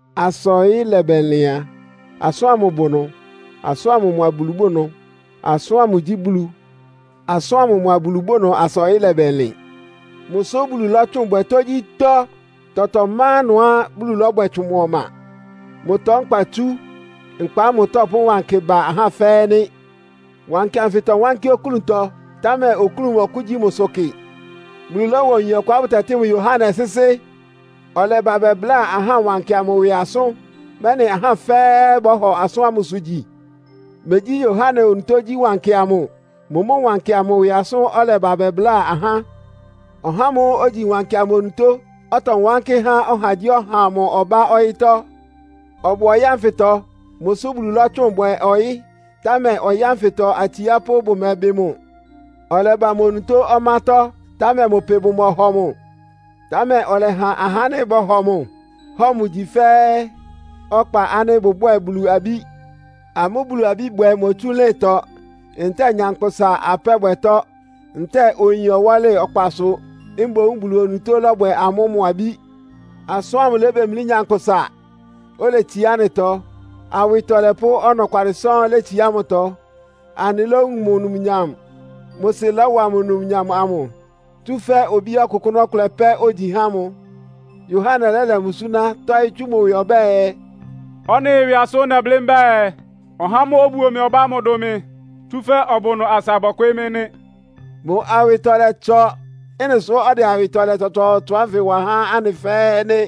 Asa ɔyɩ́ lɛbɛlɩn a, Asʋ́n ámʋ bʋ ɩnʋ. Asʋ́n ámʋ mʋa Bulu bʋ ɩnʋ. Asʋ́n ámʋ gyí Bulu. Asʋ́n ámʋ mʋa Bulu bʋ ɩnʋ asa ɔyɩ́ lɛbɛlɩn. Mʋsʋ́ Bulu lɔ́tsʋn bwɛ tógyítɔ́. Tɔtɔɔtɔ má ɩnʋá Bulu lɔ́bwɛ tsʋn mʋ ɔma. Mʋtɔ nkpa itsú. Nkpa ámʋ tɔ́pʋ́ wankɩ ba ahá fɛ́ɛ́ nɩ́. Wankɩ anfɩ tɔwánkɩ́ oklúntɔ, támɛ oklún mɔ́kʋ́gyi mʋ́sʋ́ kɩ. Bulu lɔ́wa oyin ɔkʋá bʋtɛtɩ́ mʋ Yohane sɩ́sɩ́. Ɔlɛba bɛbláa ahá wankɩ amʋ ɩwɩ asʋ́n, mɛ́nɩ ahá fɛ́ɛ́ bɔ́hɔ asʋ́n ámʋsʋ gyi. Megyí Yohane onutó gyí wankɩ amʋ. Mʋ mʋ́ wankɩ amʋ ɩwɩ asʋ́n ɔlɛba bɛbláa ahá. Ɔhá ámʋ́ʋ́ ogyi wankɩ onutó, ɔtɔwánkɩ́ há ɔhagyíɔha amʋ ɔbá ɔyɩ́tɔ́. Ɔbʋ ɔyɩ́ ánfɩtɔ. Mʋsʋ́ Bulu lɔ́tsʋn bwɛ ɔyɩ́, támɛ ɔyɩ́ ánfɩtɔ atsiápʋ́ bʋmɛbɩ mʋ. Ɔlɛba mʋ onutó ɔmátɔ́, támɛ mʋ pɩ bʋmɔhɔ mʋ. Támɛ ɔlɛha ahá ánɩ́ bɔhɔ mʋ, hɔ mʋ gyi fɛ́ɛ́ ɔkpa ánɩ́ bʋbwɛ́ɛ Bulu abí. Amʋ́ Bulu abí bwɛ motsú ɩlɩ́ntɔ, ntɛ́ɛ nyankpʋsa apɛ́bwɛtɔ, ntɛ́ɛ oyin ɔwɔ́lɩ ɔkpasʋ. Mboún Bulu onutó lɔ́bwɛ amʋ́ mʋ abí. Asʋ́n ámʋ lébemlí nyankpʋsa, oletsiá anɩtɔ. Awɩtɔlɛ pʋ́ ɔnɔkwalɩ sɔ́ɔ́n létsiá mʋtɔ. Anɩlówun mʋ numnyam. Mʋ Sɩ lɔ́wa mʋ numnyam amʋ, tsúfɛ́ Obí ɔkʋkʋ́nʋ́ ɔkʋlɛ pɛ́ ogyi há mʋ. Yohane lɛ́lɛ mʋ súná, tɔ́ɩ́ tsú mʋ ɩwɩ ɔbɛ́ɛ, “Ɔ́nɩ ɩwɩ asʋ́n nɛblɩ́ mbɛ́ɛ, ‘Ɔhá ámʋ́ʋ́ obuo mɩ ɔbá ámʋ dʋn mɩ, tsúfɛ́ ɔbʋ ɩnʋ asa bɔkwɩɩ́ mɩ́’” nɩ́. Mʋ awɩtɔlɛ ɩtsɔ. Ɩ́nɩ sʋ́ ɔdɛ awɩtɔlɛ tsɔtsɔɔtsɔ ánfɩ wa há anɩ fɛ́ɛ́ nɩ́.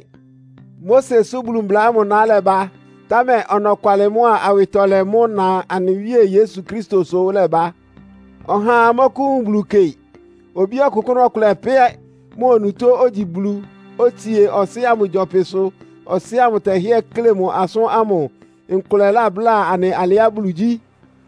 Mosesʋ Bulu mbla ámʋ ná ɩlɛba, támɛ ɔnɔkwalɩ mʋ́a awɩtɔlɛ mʋ́ ɩna anɩ Wíe Yesu Kristosʋ ɩlɛba. Ɔhaa mɔ́kʋ́wun Bulu kɩ. Obí ɔkʋkʋ́nʋ́ ɔkʋlɛ pɛ́, mʋ onutó ogyi Bulu, otsie Ɔsɩ́ ámʋ gyɔpɩsʋ, Ɔsɩ́ ámʋ tɛhɩ́ɛ́ kle mʋ asʋ́n ámʋ, nkʋlɛ labláa anɩ alɩá Bulu gyí.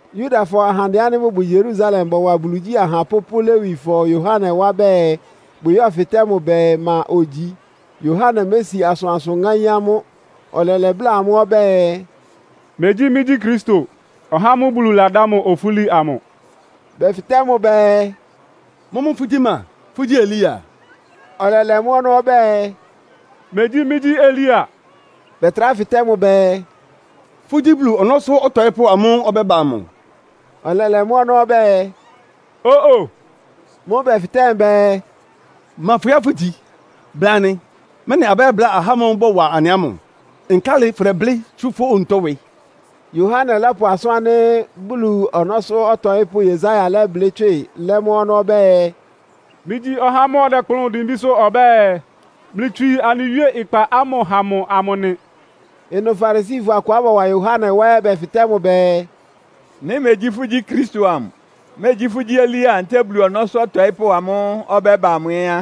Yudafɔ ahandɛ ánɩ́ bʋbʋ Yerusalem bɔwa Bulu igyí ahapʋ́ pʋ́ Lewifɔ Yohane wá bɛɛ bʋyɛ́fɩtɛ́ mʋ bɛɛ, ma ogyi? Yohane mési asʋansʋ ŋáín amʋ́. Ɔlɛlɛ bláa amʋ́ ɔbɛ́ɛ, “Megyí mɩ́gyí Kristo, (ɔhá ámʋ́ʋ́ Bulu ladá mʋ ofúli amʋ).” Bɛfɩtɛ́ mʋ bɛɛ, “Mʋ́mʋ́ fʋ́gyí ma? Fʋ́gyí Elia?” Ɔlɛlɛ mʋ́ ɔnɔ́ ɔbɛ́ɛ, “Megyí mɩ́gyí Elia.” Bɛtrá fɩtɛ́ mʋ bɛɛ, “Fʋ́gyí Bulu ɔnɔ́sʋ́ ɔtɔɩ́pʋ́ amʋ́ʋ́ ɔbɛ́ba amʋ?” Ɔlɛlɛ mʋ́ ɔnɔ́ ɔbɛ́ɛ, “Ó-o.” Mʋ́ʋ́ bɛfɩtɛ́ mʋ bɛɛ, “Ma fʋhɩ́ɛ́ fʋgyi? Bla anɩ, mɛ́nɩ abɛ́yɛ́bláa ahá ámʋ́ʋ́ bɔwa anɩ ámʋ. Nkálɩ fʋ́dɛblɩ́ tsú fʋ́ onutó ɩwɩ?” Yohane lɔ́pʋ asʋ́n ánɩ́ Bulu ɔnɔ́sʋ́ ɔtɔɩ́pʋ́ Yesaia lɛ́blɩ́ tswɩ lɛ́ mʋ́ ɔnɔ́ ɔbɛ́ɛ, “Mɩ́gyí ɔhá ámʋ́ʋ́ ɔdɛkplʋ́n dimbísʋ́ ɔbɛ́ɛ, ‘Mlɩtswii anɩ Wíe ɩkpa ámʋ ha mʋ’ amʋ nɩ.” Ɩnʋ Farisifɔ akʋá bɔwa Yohane wá ɛ́ bɛfɩtɛ́ mʋ bɛɛ, “Nɩ́ megyí fʋ́gyí Kristo amʋ, megyí fʋ́gyí Elia ntɛ́ɛ Bulu Ɔnɔ́sʋ́ Ɔtɔɩ́pʋ́ amʋ́ʋ́ ɔbɛ́ba amʋ ɛ́ á,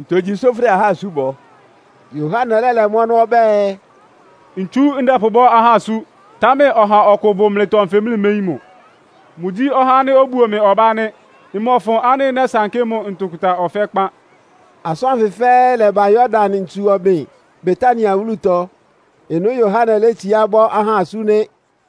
ntogyi sʋ́ fʋdɛ ahá asú bɔ?” Yohane lɛ́lɛ mʋ́ ɔnɔ́ ɔbɛ́ɛ, “Ntsu ndɛpʋbɔ́ ahá asú, támɛ ɔha ɔkʋ bʋ mlɩtɔ nfɩ, mlɩméyín mʋ. Mʋgyí ɔhá ánɩ́ obuo mɩ ɔbá nɩ́. Mmɔfʋn ánɩ́ nɛ́sankɩ́ mʋ ntʋkʋta ɔfɛ́ kpán.” Asʋ́n ánfɩ fɛ́ɛ́ lɛ́ba Yordan ntsu ɔbɩn Betania wúlutɔ. Ɩnʋ́ Yohane létsiá bɔ́ ahá asú nɩ́.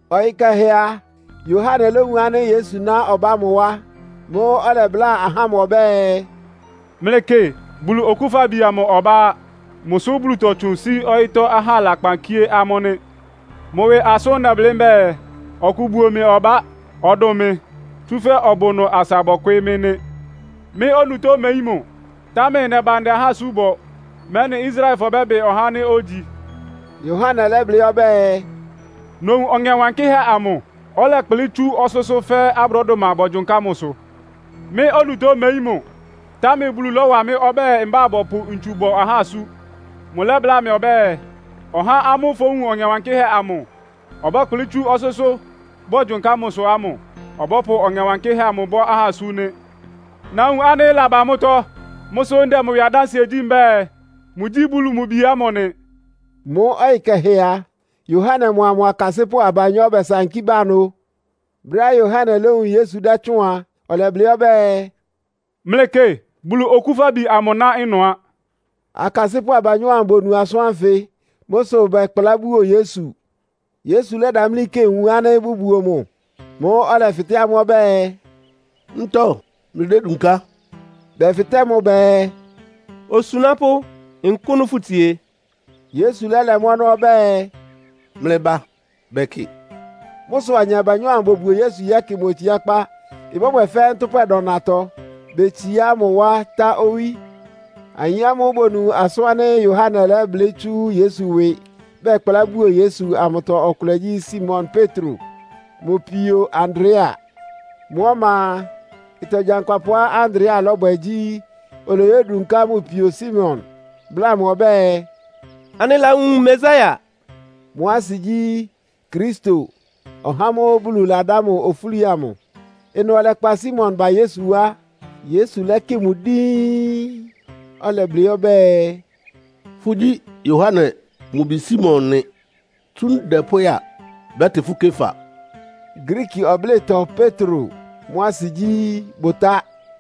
Ɔyɩ kɛhɛ a, Yohane lówun ánɩ́ Yesu ná ɔbá mʋ wá. Mʋ́ʋ́ ɔlɛbláa ahá ámʋ ɔbɛ́ɛ, “Mlɩkɩ, Bulu Okúfabi amʋ ɔbá á. Mʋsʋ́ Bulu tɔtsʋn sí ɔyɩ́tɔ́ ahá lakpan kíé amʋ́ nɩ́! Mʋ ɩwɩ asʋ́n nɛblɩ́ mbɛ́ɛ, ‘Ɔkʋ buo mɩ ɔbá. Ɔdʋn mɩ, tsúfɛ́ ɔbʋ ɩnʋ asa bɔkwɩɩ́ mɩ́’ nɩ́. Mɩ́ onutó mmeyín mʋ, támɛ nɛba ndɛ ahá asú bɔ, mɛ́nɩ Israelfɔ bɛ́bɩ ɔhá ánɩ́ ogyi.” Yohane lɛ́blɩ́ ɔbɛ́ɛ, “Nowun Ɔŋɛ Wankɩ́hɛ́ amʋ, ɔlɛkplɩ́ tsú ɔsʋ́sʋ́ fɛ́ abrɔ́dʋma bogyonká mʋsʋ. Mɩ́ onutó mmeyín mʋ, támɛ Bulu lɔ́wa mɩ́ ɔbɛ́ɛ mbá bɔpʋ ntsu bɔ ahá asú. Mʋlɛ́bláa mɩ ɔbɛ́ɛ, ‘Ɔhá ámʋ́ʋ́ fówun Ɔŋɛ Wankɩ́hɛ́ amʋ ɔbɛ́kplɩ́ tsú ɔsʋ́sʋ́ bogyonká mʋsʋ ámʋ ɔbɔ́pʋ Ɔŋɛ Wankɩ́hɛ́ amʋ bɔ́ ahá asú nɩ́.’ Nawun ánɩ́ ɩlaba mʋ́tɔ́. Mʋ́ sʋ ndɛ mʋ ɩwɩ adánsɩɛ gyí mbɛ́ɛ, mʋgyí Bulu mʋ Bi ámʋ nɩ.” Mʋ́ ɔyɩ kɛhɛ a, Yohane mʋa mʋ akasɩ́pʋ́ abanyɔ́ bɛsankí ba ɩnʋ. Brɛ́á Yohane lówun Yesu dɛ́tsʋ́ʋn a, ɔlɛblɩ́ ɔbɛ́ɛ, “Mlɩkɩ, Bulu Okúfabi amʋ ná ɩnʋ á.” Akasɩ́pʋ́ abanyɔ́ ámʋ bonu asʋ́n ánfɩ. Mʋ́ sʋ bɛkplá buo Yesu. Yesu lɛ́damlí kɩ wun ánɩ́ bʋbuo mʋ. Mʋ́ʋ́ ɔlɛfɩtɛ́ amʋ́ ɔbɛ́ɛ, “Ntɔ mlɩdédunká?” Bɛfɩtɛ́ mʋ bɛɛ, “Osunápʋ́, nkʋ́nʋ fʋtsie?” Yesu lɛ́lɛ mʋ́ ɔnɔ́ ɔbɛ́ɛ, “Mlɩba bɛkɩ.” Mʋ́ sʋ ayin abanyɔ́ ámʋ bobuo Yesu yɛ́kɩ mʋ otsiákpá. Ɩbɔ́bwɛ fɛ́ ntʋ́pwɛ dɔnatɔ. Betsiá mʋ wá tá owí. Ayin ámʋ́ʋ́ bonu asʋ́n ánɩ́ Yohane lɛ́blɩ́ tsú Yesu ɩwɩ, bɛkplá buo Yesu amʋtɔ ɔkʋlɛ gyí Simon Petro mʋ pio Andrea. Mʋ́ ɔma a, ɩtɔ gyankpapʋá Andrea lɔ́bwɛ gyí, oloyódunká mʋ pio Simon, bláa mʋ ɔbɛ́ɛ, “Anɩlawun Mesia.” (Mʋ́ asɩ gyí, “Kristo”, ɔhá ámʋ́ʋ́ Bulu ladá mʋ ofúli amʋ.) Ɩnʋ ɔlɛkpa Simon ba Yesu wá. Yesu lɛ́kɩ mʋ díín, ɔlɛblɩ́ ɔbɛ́ɛ, “Fʋ́gyí Yohane mʋ bi Simon nɩ. Tsú ndɛ pʋ́ya a, bɛ́tɩ fʋ́ Kefa.” (Griiki ɔblɩ́tɔ “Petro.” Mʋ́ asɩ gyí, “Bʋtá.”)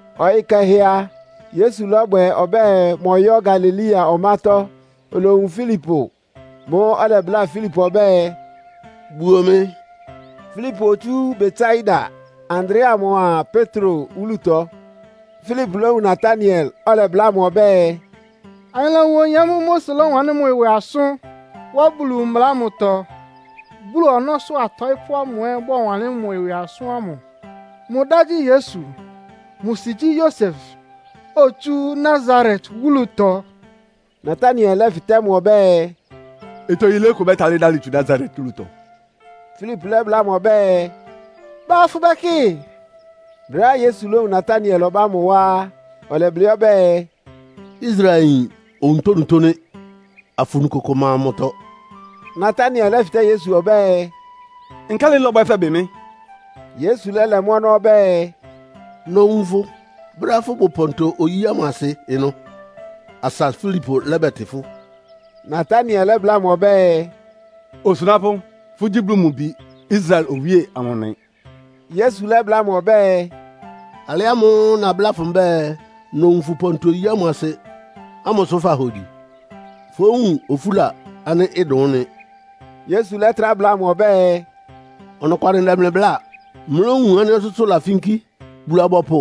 Ɔyɩ́ kɛhɛ a, Yesu lɔ́bwɛ ɔbɛ́ɛ mɔ́yɔ Galilea ɔmátɔ́, olowun Filipo. Mʋ́ʋ́ ɔlɛbláa Filipo ɔbɛ́ɛ, “Buo mɩ.” Filipo otsú Betsaida, Andrea mʋa Petro wúlutɔ. Filipo lówun Nataniel, ɔlɛbláa mʋ ɔbɛ́ɛ, “Anɩlawun oyin ámʋ́ʋ́ Mose lɔ́wanlɩ́n mʋ ɩwɩ asʋ́n wá Bulu mbla ámʋtɔ, Bulu ɔnɔ́sʋ́ atɔɩ́pʋ́ amʋ ɛ́ bɔwanlɩ́n mʋ ɩwɩ asʋ́n ámʋ. Mʋ dá gyí Yesu. Mʋ sɩ gyí Yosef, otsú Nasaret wúlutɔ.” Nataniel lɛ́fɩtɛ́ mʋ ɔbɛ́ɛ, “Ɩtɔ yilé kʋ bɛ́talɩ́ dalɩ tsu Nasaret wúlutɔ?” Filipo lɛ́bláa mʋ ɔbɛ́ɛ, “Ba afʋbɛkɩ.” Brɛ́á Yesu lówun Nataniel ɔbá mʋ wá á, ɔlɛblɩ́ ɔbɛ́ɛ, “Israelyin onutónutó nɩ́. Afunu kʋkʋ ma mʋtɔ.” Nataniel lɛ́fɩtɛ́ Yesu ɔbɛ́ɛ, “Nkálɩ lɔbwɛ fɛbɩ mɩ́?” Yesu lɛ́lɛ mʋ́ ɔnɔ́ ɔbɛ́ɛ, “Nowun fʋ brɛ́á fʋbʋ pɔntɔ-oyí ámʋ asɩ ɩnʋ, asa Filipo lɛ́bɛtɩ fʋ́.” Nataniel lɛ́bláa mʋ ɔbɛ́ɛ, “Osunápʋ́, fʋ́gyí Bulu mʋ Bi Israel Owíe amʋ nɩ.” Yesu lɛ́bláa mʋ ɔbɛ́ɛ, “Alɩ ámʋ́ʋ́ nabláa fʋ mbɛ́ɛ, nowun fʋ pɔntɔ-oyí ámʋ asɩ ámʋ sʋ fahogyi? Fówun ofúla ánɩ́ ɩdʋn ɩ́nɩ.” Yesu lɛ́trá bláa mʋ ɔbɛ́ɛ, “Ɔnɔkwalɩ ndɛ mlɩ bláa, mlówun ánɩ́ ɔsʋ́sʋ́ lafínkí, Bulu-abɔpʋ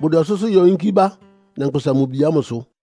bʋdɛ ɔsʋ́sʋ́ yɔ yínkí bá Nyankpʋsa-Mʋ-Bi ámʋsʋ.”